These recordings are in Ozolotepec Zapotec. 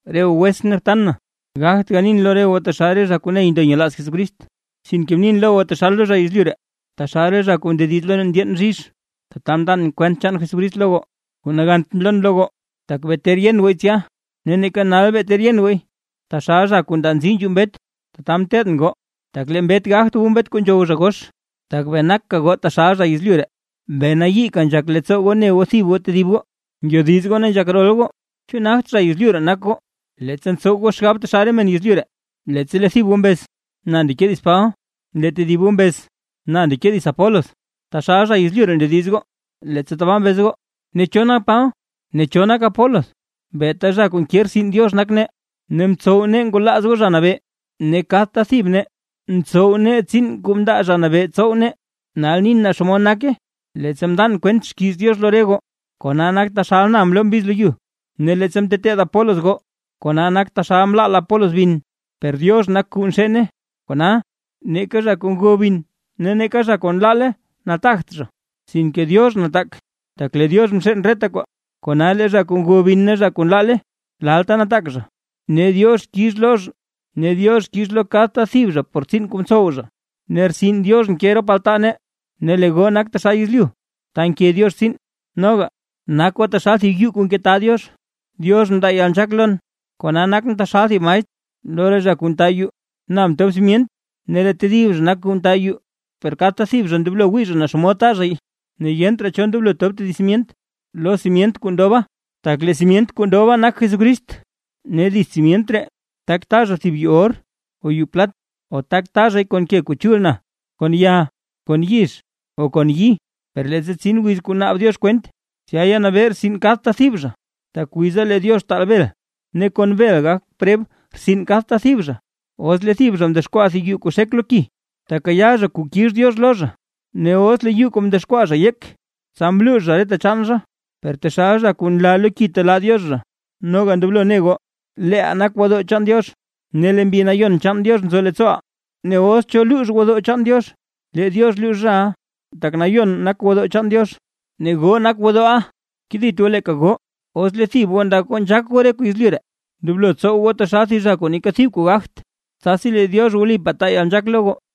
Re goo wetsʼn ne btan na, ngogt ganin lo goo taxal re zha kuu ney ndo nyelaaz Jesucrist, sinke mnin lo goo taxal lo zha yezlyu ree, taxal zha kuu ndediz lo re ndyeen bzhizh, tata mndan kwent chaan Jesucrist lo goo. Kuu nagant mloon lo goo, tak bee ter yen gooy tsya ne neeka nal bee ter yen gooy; taxal zha kuu ndaa nzii nzhuu mbet, tata mteteedʼn goo, tak lee mbet gagt wu mbet kuu nzhow zha gox, tak bee naka goo taxal zha yezlyu ree. Bee nayiika nzhak leettsoo goo ne goo tedib goo, ngyodiz goo ne nzhak rol goo. ¿Chu nagt zha yezlyu ree nak goo, leettsa ntsow goo xgab taxal re men yezlyu ree? Leettsa lee thib goo mbez: “Na ndeke dits Paba”, lee tedib goo mbez: “Na ndeke dits Apolos”, taxal zha yezlyu ree ndediz goo, leettsa tabaa mbez goo. Ne, ¿cho nak Paba? Ne ¿cho nak Apolos? Beeta zha kuu nke rtsin Diox nak nee, ne mtsow nee ngwalaaz goo Zha Nabee. Ne kadta thib nee ntsow nee tsiin kuu mndaa Zha Nabee tsow nee. Nal nin naa xomod nake; leettsa mndan kwent xkiiz Diox lo re goo, kona nak taxal na mloo mbiz lo yu; ne leettsa mteteed Apolos goo, kona nak taxal mlaal Apolos bin, per Diox nak kuu nxeene. Kona, neeka zha kuu ngo bin ne neeka zha kuu nlaale nataagt zha, sinke Diox nataak, tak lee Diox nxeen reta kwaa. Kona lee zha kuu ngo bin ne zha kuu nlaale, lalta nataak zha, ne Diox kix lo kadta thib zha por tsiin kuu mtsow zha. Ne rtsin Diox nke rop altaa nee, ne lee goo nak taxal yezlyu ta nke Diox tsiin. Noga, nak goo taxal thib yuu kuu ngetaa Diox. Diox mndaa yalnzhaak lon, kona nakʼn taxal thib maestr lo re zha kuu nta yuu. Na mtob simyent ne lee tedib zha nak kuu nta yuu. Per kadta thib zha ndoblo wii zha naa xomod ta zhay. Ne yent raa cho ndoblo tob tedib simyent lo simyent kuu ndoba, tak lee simyent kuu ndoba nak Jesucrist. Ne dits simyent ree, tak ta zha thib yuu or o yuu plat o tak ta zhay kon ke kuu chul na, kon ya, kon yizh o kon yi. Per leettsa tsin wiz kuu naab Diox kwent, tsya yanabee rtsin kadta thib zha, tak wiza lee Diox taal bel, ne kon bel gak preb rtsin kadta thib zha. Os lee thib zha mdexkwaa thib yuu kuu xek lo ki, tekayaa zha kuu kix Diox lo zha. Ne os lee yuu kuu mdexkwaa zha yek, tsa mluux zha reta chaan zha, per taxal zha kuu nlaa lo ki telaa Diox zha. Noga ndoblo ne goo, leeʼaa nak gwodoo chaan Diox, ne lee Mbi Nayon chaan Diox nzo leettsooʼaa. Ne os cho luux gwodoo chaan Diox, lee Diox luux zhaʼa, tak nayon nak gwodoo chaan Diox, ne goo nak gwodooʼa. Kedit goo leeka goo; os lee thib goo ndak goo nzhaak goo re kuu yezlyu ree, ndoblo tsow goo taxal thib zha kuu neeka thib kuu gagt, tsasi lee Diox wlipaa taa yalnzhaak lo goo.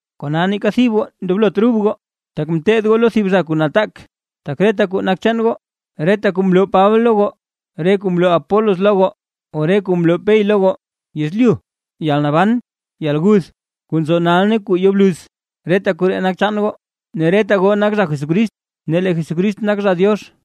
Kona neeka thib goo ndoblot rub goo, tak ngeteed goo lo thib zha kuu nataak, tak reta kuu nak chaan goo: reta kuu mloo Paba lo goo, re kuu mloo Apolos lo goo o re kuu mloo Pey lo goo, yezlyu, yalnaban, yalguth, kuu nzo nal ne kuu yo bluz, reta koree nak chaan goo, ne reta goo nak zha Jesucrist, ne lee Jesucrist nak zha Diox.